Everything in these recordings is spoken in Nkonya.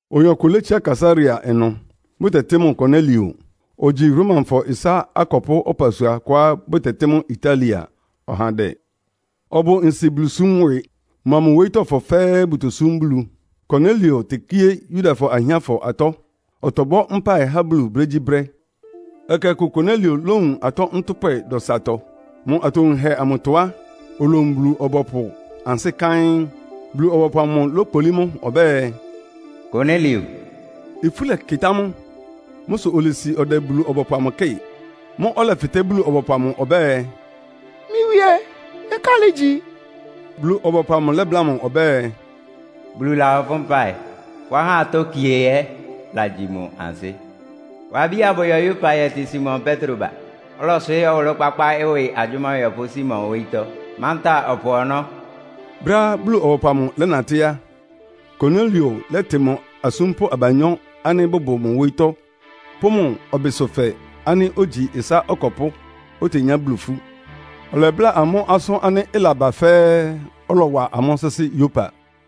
Oyin ɔkʋ létsiá Kaesarea ɩnʋ, bʋtɛtɩ́ mʋ Konelio. Ogyi Romafɔ ɩsá akɔpʋ́ ɔpasua kʋá bʋtɛtɩ́ mʋ́ Italia ɔhandɛ. Ɔbʋ nsi Bulusúm ɩwɩ. Mʋa mʋ wóyítɔ́fɔ fɛ́ɛ́ bʋtosúm Bulu. Konelio tekíé Yudafɔ ahiánfɔ atɔ́. Ɔtɔbɔ́ mpáɩ há Bulu brégyíbrɛ́. Ɛkɛ ɔkʋ Konelio lówun atɔ́ ntʋ́pwɛ dɔsatɔ. Mʋ atowunhɛ amʋtɔ á, olowun Bulu-ɔbɔpʋ ansɩ́ káɩ́n, Bulu-ɔbɔpʋ amʋ lókpolí mʋ ɔbɛ́ɛ, “Konelio!” Ifú lɛkɩtá mʋ. Mʋ́ sʋ olesi ɔdɛ Bulu-ɔbɔpʋ amʋ kɩ́ɩ. Mʋ́ʋ́ ɔlɛfɩtɛ́ Bulu-ɔbɔpʋ amʋ ɔbɛ́ɛ, “Mɩ́ Wíé, nkálɩ́ igyi?” Bulu-ɔbɔpʋ amʋ lɛ́bláa mʋ ɔbɛ́ɛ, “Bulu lahɔ fʋ́ mpáɩ. Fʋ́ ahá atɔ́ kie ɛ́ lagyi mʋ ansɩ́. Wa abí abʋyɔ Yopa yɛtɩ Simon Petro ba. Ɔlɔyɔ́swɩɩ́ ɔwʋlʋ́-kpákpá ɩwɩ agyʋ́má ɔyɔpʋ́ Simon wóyítɔ́, mantáa ɔpʋ ɔnɔ́.” Brɛ́á Bulu-ɔbɔpʋ amʋ lɛ́natɩ́ á, Konelio lɛ́tɩ mʋ asúmpʋ́ abanyɔ́ ánɩ́ bʋbʋ mʋ wóyítɔ́ pʋ́ mʋ ɔbɩsʋfɛ ánɩ́ ogyi ɩsá ɔkɔpʋ́, otenyá Bulu ifú. Ɔlɛbláa amʋ́ asʋ́n ánɩ́ ɩlaba fɛ́ɛ́, ɔlɔwa amʋ́ sɩ́sɩ́ Yopa.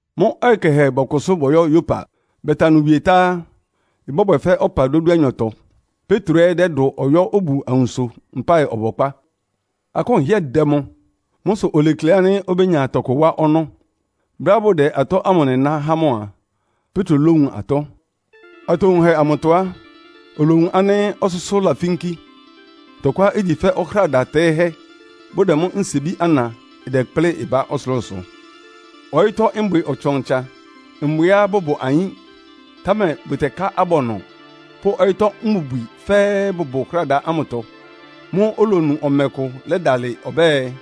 Mʋ́ ɔyɩ kɛhɛ bɔkʋsʋ́ bɔyɔ́ Yopa. Bɛta ɩnʋ wie tá á, ɩbɔ́bwɛ fɛ́ ɔpa dódúanyɔtɔ. Petro ɛ́ dɛ́dʋ ɔyɔ́ obu awunso mpáɩ ɔbɔkpá. Akʋ́n ɩhɩ́ɛ́ dɛ mʋ. Mʋ́ sʋ olekle ánɩ́ obénya tɔkʋ wá ɔnɔ́. Brɛ́á bʋdɛ atɔ́ ámʋ nɩná há mʋ a, Petro lówun atɔ́. Atowunhɛ amʋtɔ á, olowun ánɩ́ ɔsʋ́sʋ́ lafínkí, tɔkʋá igyi fɛ́ ɔhráda tɛ́ɩ́hɛ́, bʋdɛ mʋ nsiebí ana, ɩdɛkplɩ́ ɩbá ɔsʋlʋ́sʋ. Ɔyɩ́tɔ́ mbwɩ ɔtsan-ɔtsan, mbwɩá bʋbʋ ayín, támɛ bʋtɛká abɔnɔ pʋ́ ɔyɩ́tɔ́ mbubwi fɛ́ɛ́ bʋbʋ ɔhráda ámʋtɔ. Mʋ́ʋ́ olonu ɔmɛ kʋ lɛ́dalɩ ɔbɛ́ɛ,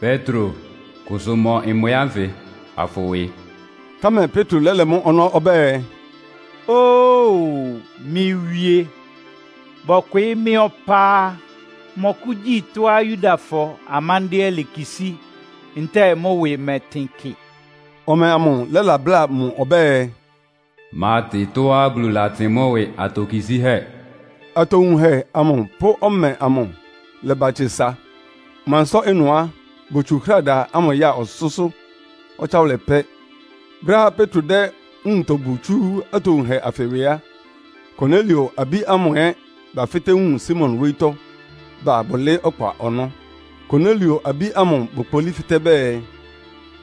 “Petro, kʋsʋ mɔ mbwɩ ánfɩ afʋwɩ.” Támɛ Petro lɛ́lɛ mʋ́ ɔnɔ́ ɔbɛ́ɛ, “Ó-o! Mɩ́ Wíé, bɔkwɩɩ́ mɩ́ ɔpá á, mmɔkʋ́gyi tɔ́á Yudafɔ amándɩ́ɛ́ lekisí ntɛ́ɛ mʋ́ ɩwɩ mɛtɩn kɩ.” Ɔmɛ amʋ lɛ́la bláa mʋ ɔbɛ́ɛ, “Mátɩ tɔ́á Bulu latɩn mʋ́ ɩwɩ atokisíhɛ́.” Atowunhɛ amʋ pʋ́ ɔmɛ amʋ lɛ́ba tse sa. Mʋ ansɩ́tɔ́ ɩnʋ á, botsu ɔhráda ámʋ ya ɔsʋ́sʋ́ ɔtsáwʋlɛ pɛ́. Brɛ́á Petro dɛ́ nwuntɔ bu tsú atowunhɛ anfɩ ɩwɩ á, Konelio abí ámʋ ɛ́ bafɩ́tɛ́ wun Simon wóyítɔ́, ba bʋlɩɩ́ ɔkpa ɔnɔ́. Konelio abí ámʋ bokpolí fɩ́tɛ́ bɛɛ,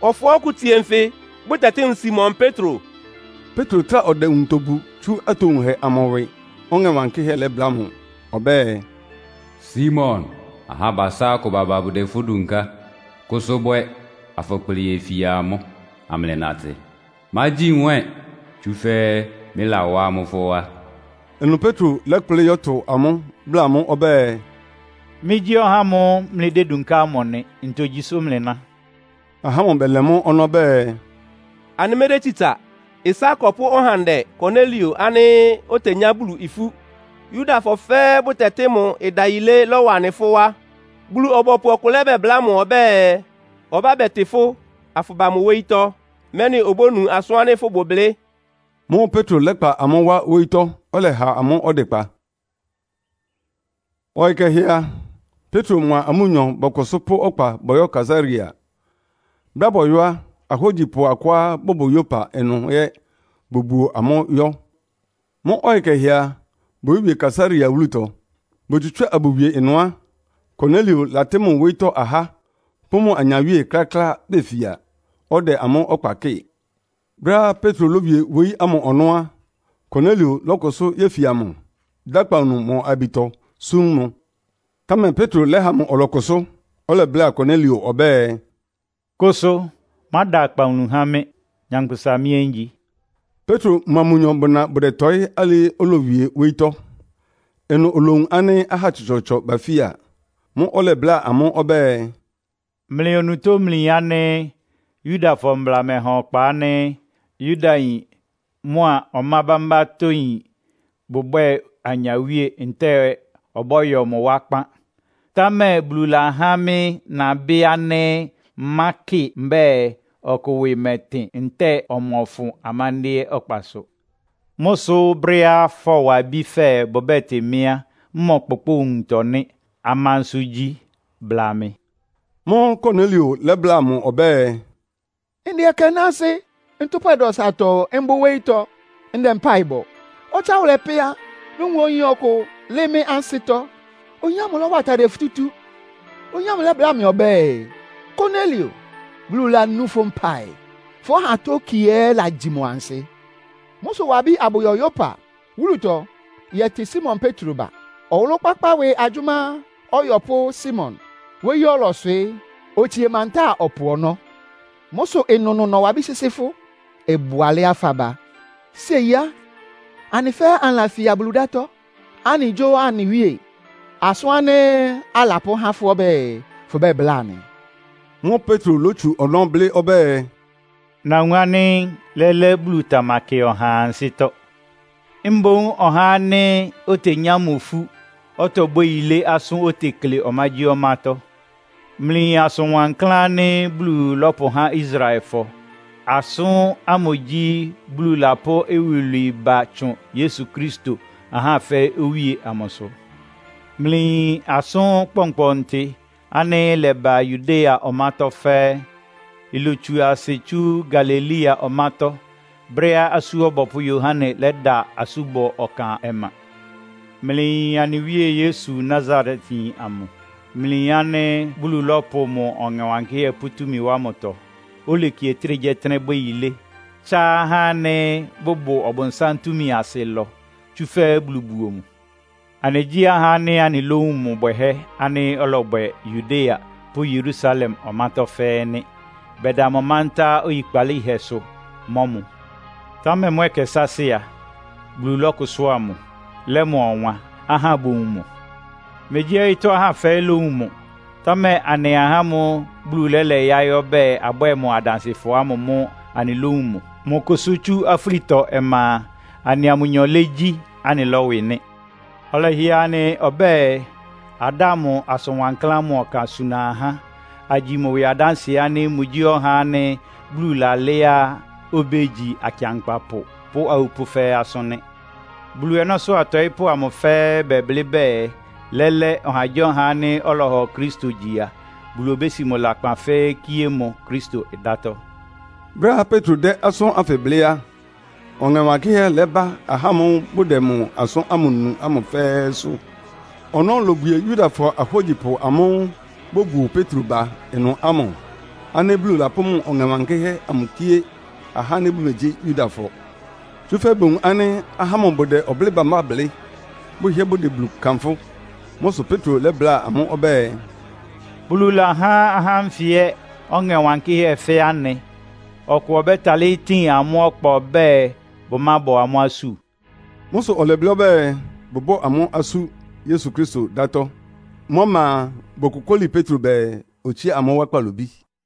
“Ɔfɔɔ́ ɔkʋ tsie nfɩ, bʋtɛtɩ́ mʋ Simon Petro?” Petro trá ɔdɛ nwuntɔ bu tsú atowunhɛ amʋ ɩwɩ, Ɔŋɛ Wankɩ́hɛ́ lɛ́bláa mʋ ɔbɛ́ɛ, “Simon, ahá abasá akʋ baba bʋdɛ fʋ́ dunká. Kʋsʋ bwɛ, afʋkplɩ yefia amʋ́ amlɩnatɩ. Mágyi nwɛ́ɛn, tsúfɛ́ mɩ́lawá amʋ́ fʋ́ wá.” Ɩnʋ Petro lɛ́kplɩ́ yɔ́tʋ amʋ́, bláa amʋ́ ɔbɛ́ɛ, “Mɩ́gyí ɔhá ámʋ́ʋ́ mlɩdédunká ámʋ nɩ. Ntogyi sʋ́ mlɩná?” Ahá ámʋ bɛlɛ mʋ́ ɔnɔ́ bɛɛ, “Anɩmɛ́dɛ́ tsitsa. Ɩsá akɔpʋ́ ɔhandɛ Konelio ánɩ́ otenyá Bulu ifú, Yudafɔ fɛ́ɛ́ bʋtɛtɩ́ mʋ ɩdayilé lɔ́wa anɩ fʋ́ wá. Bulu-ɔbɔpʋ ɔkʋ labɛbláa mʋ ɔbɛ́ɛ, ɔbá bɛtɩ fʋ́ afʋba mʋ wóyítɔ́, mɛ́nɩ obónu asʋ́n ánɩ́ fʋ́bʋ blɩ́.” Mʋ́ʋ́ Petro lɛ́kpa amʋ́ wá wóyítɔ́, ɔlɛha amʋ́ ɔdɩkpa. Ɔyɩ kɛhɛ a, Petro mʋa amʋ́nyɔ bɔkʋsʋ́ pʋ́ ɔkpa bɔyɔ́ Kaesarea. Brɛ́á bɔyɔ́ á, ahógyipʋ akʋá bʋbʋ Yopa ɩnʋ ɛ́ bobuo amʋ́ yɔ́. Mʋ́ ɔyɩ kɛhɛ a, boyówie Kaesarea wúlutɔ. Botsutsúa abʋwie ɩnʋ á, Konelio latɩ́ mʋ wóyítɔ́ ahá pʋ́ mʋ anyawíe kláklá befia, ɔdɛ amʋ́ ɔkpa kɩ́ɩ. Brɛ́á Petro lówie wóyí ámʋ ɔnɔ́ á, Konelio lɔ́kʋsʋ́ yéfia mʋ, dá akpawunu mʋ ayabitɔ súm mʋ. Támɛ Petro lɛ́ha mʋ ɔlɔkʋsʋ́. Ɔlɛbláa Konelio ɔbɛ́ɛ, “Kʋsʋ, máda akpawunu há mɩ́. Nyankpʋsa mɩ́ ɛ́ ngyi.” Petro mʋa mʋnyɔ bʋna bʋdɛtɔɩ́ alɩɩ olowie wóyítɔ́. Ɩnʋ olowun ánɩ́ ahá tsɔtsɔɔtsɔ bafia. Mʋ́ʋ́ ɔlɛbláa amʋ́ ɔbɛ́ɛ, “Mlɩ onutó mlɩyin ánɩ́ Yudafɔ mbla mɛha ɔkpa ánɩ́ Yudayin mʋa ɔmá bámbátɔ́yin bʋbwɛ́ɛ anyawíe ntɛ́ɛ ɔbɔ́yɔ mʋ wá kpán. Támɛ Bulu lahá mɩ́ nabɩ́ ánɩ́ mmákɩ mbɛ́ɛ ɔkʋ ɩwɩ mɛtɩn ntɛ́ɛ ɔmɔfʋn amándɩ́ɛ́ ɔkpasʋ. Mʋ́ sʋ́ brɛ́á fɔwa abí fɛ́ɛ́ bʋbɛ́tɩ mɩ́ á, mmɔkpʋkpʋ́ʋ nwuntɔ nɩ́. Amansʋ igyi? Bla mɩ.” Mʋ́ʋ́ Konelio lɛ́bláa mʋ ɔbɛ́ɛ, “Ndɛ ɛkɛ náásɩ́, ntʋ́pwɛ dɔsatɔ mbʋ wóyítɔ́ ndɛ mpáɩ bɔ. Ɔtsáwʋlɛ pɛ́ á, nowun oyin ɔkʋ lɩ́ɩ́ mɩ́ ansɩ́tɔ́. Oyin ámʋ lɔ́wa atadɩɛ futútú. Oyin ámʋ lɛ́bláa mɩ ɔbɛ́ɛ, ‘Konelio, Bulu lanú fʋ́ mpáɩ. Fʋ́ ahá atɔ́ kie ɛ́ lagyi mʋ ansɩ́. Mʋ́ sʋ wa abí abʋyɔ Yopa wúlutɔ yɛtɩ Simon Petro ba. Ɔwʋlʋ́-kpákpá ɩwɩ agyʋ́má ɔyɔpʋ́ Simon wóyí ɔlɔswɩɩ́. Otsie mantáa ɔpʋ ɔnɔ́.’ Mʋ́ sʋ ɩnʋnʋ nɔwa abí sɩ́sɩ́ fʋ́. Ɩbʋ alɛ́á faba. Séi á, anɩ fɛ́ɛ́ anɩlafia Bulu dátɔ́. Anɩgyó anɩ Wíe asʋ́n ánɩ́ alapʋ́há fʋ́ ɔbɛ́ɛ, fʋbláa anɩ.” Mʋ́ʋ́ Petro lótsu ɔnɔ́ blɩ́ ɔbɛ́ɛ, “Nawun ánɩ́ lɛ́lɛ́ Bulu tamakɩ ɔhaa ansɩ́tɔ́. Mboún ɔhá ánɩ́ otenyá mʋ ifú, ɔtɔbwɛ́ yilé asʋ́n otekle ɔmágyíɔmátɔ́. Mlɩyin asʋn wankláán ánɩ́ Bulu lɔ́pʋhá Israelfɔ. Asʋ́n ámʋ gyí, Bulu lapʋ́ iwilwii ba tsʋn Yesu Kristo, ahá fɛ́ɛ́ Owíe amʋsʋ. Mlɩyin asʋ́n kpɔnkpɔntɩ ánɩ́ ɩlɛba Yudea ɔmátɔ́ fɛ́ɛ́. Ilotsu asɩ tsú Galilea ɔmátɔ́, brɛ́á Asú Ɔbɔpʋ́ Yohane lɛ́da asúbɔ ɔkan ɔma. Mlɩyin anɩ Wíe Yesu Nasaretyin amʋ. Mlɩyin ánɩ́ Bulu lɔ́pʋ mʋ Ɔŋɛ Wankɩ́hɛ́ pʋ́ túmi wá mʋtɔ, oleki ɔtɩ́nɛgyíɔtɩ́nɛ́ bwɛ́ yilé, tsá ahá ánɩ́ bʋbʋ ɔbʋnsám túmi asɩ ɩlɔ, tsúfɛ́ Bulu buo mʋ. Anɩgyí ahá ánɩ́ anɩlówun mʋ bwɛhɛ́ ánɩ́ ɔlɔbwɛ Yudea pʋ́ Yerusalem ɔmátɔ́ fɛ́ɛ́ nɩ́. Bɛda mʋ mántá oyikpalíhɛsʋ mɔ́ mʋ. Támɛ mʋ́ ɛkɛ sáásɩ́ a, Bulu lɔ́kʋsʋ́a mʋ, lɛ́ mʋ ɔwan, ahá bowun mʋ. Megyí ɔyɩ́tɔ́ ahá fɛ́ɛ́ lówun mʋ, támɛ anɩ ahá ámʋ́ʋ́ Bulu lɛ́lɛ yáɩ́ ɔbɛ́ɛ, abwɛ́ɛ mʋ adansɩfɔ ámʋ mʋ́ anɩlówun mʋ. Mʋ kʋ́sʋ́ tsú afúlitɔ ɔma a, anɩa mʋnyɔ légyi, anɩlɔ́wɩ nɩ́. Ɔlɛhɩɛ anɩ ɔbɛ́ɛ, adáa mʋ asʋn wankláán ámʋ ɔkan suna ahá, agyi mʋ ɩwɩ adánsɩɛ ánɩ́ mʋgyí ɔhá ánɩ́ Bulu lalɛ́á obégyi akɩankpapʋ pʋ́ awupʋ́ fɛ́ɛ́ asʋ́n nɩ́. Bulu ɔnɔ́sʋ́ atɔɩ́pʋ́ amʋ fɛ́ɛ́ bɛblɩ́ bɛɛ lɛ́lɛ́, ɔhagyíɔha ánɩ́ ɔlɔhɔ Kristo gyi a, Bulu obési mʋ lakpan fɛ́ɛ́ kíé mʋ Kristo dátɔ́.” Brɛ́á Petro dɛ́ asʋ́n ánfɩ blɩ́ á, Ɔŋɛ Wankɩ́hɛ́ lɛ́bá ahá ámʋ́ʋ́ bʋdɛ mʋ asʋ́n ámʋ nu ámʋ fɛ́ɛ́sʋ́. Ɔnɔ́ lobwie Yudafɔ ahógyipʋ amʋ́ʋ́ bobuo Petro ba ɩnʋ ámʋ ánɩ́ Bulu lapʋ́ mʋ Ɔŋɛ Wankɩ́hɛ́ amʋ kíé ahá ánɩ́ bʋmegyí Yudafɔ. Tsúfɛ́ bowun ánɩ́ ahá ámʋ bʋdɛ ɔblɩ́ɩ bámbá blɩ́, bʋhɩ́ɛ́ bʋdɛ Bulu kanfʋ́. Mʋ́ sʋ Petro lɛ́bláa amʋ́ ɔbɛ́ɛ, “Bulu lahá ahá ánfɩ ɛ́ Ɔŋɛ Wankɩ́hɛ́ fɛ́ anɩ. Ɔkʋ ɔbɛ́talɩ́ tin amʋ́ ɔkpa ɔbɛ́ɛ bʋmábɔ amʋ́ asú?” Mʋ́ sʋ ɔlɛblɩ́ ɔbɛ́ɛ, bʋbɔ́ amʋ́ asú Yesu Kristo dátɔ́. Mʋ́ ɔma a, bokokóli Petro bɛɛ, otsía amʋ́ wá kpalobí.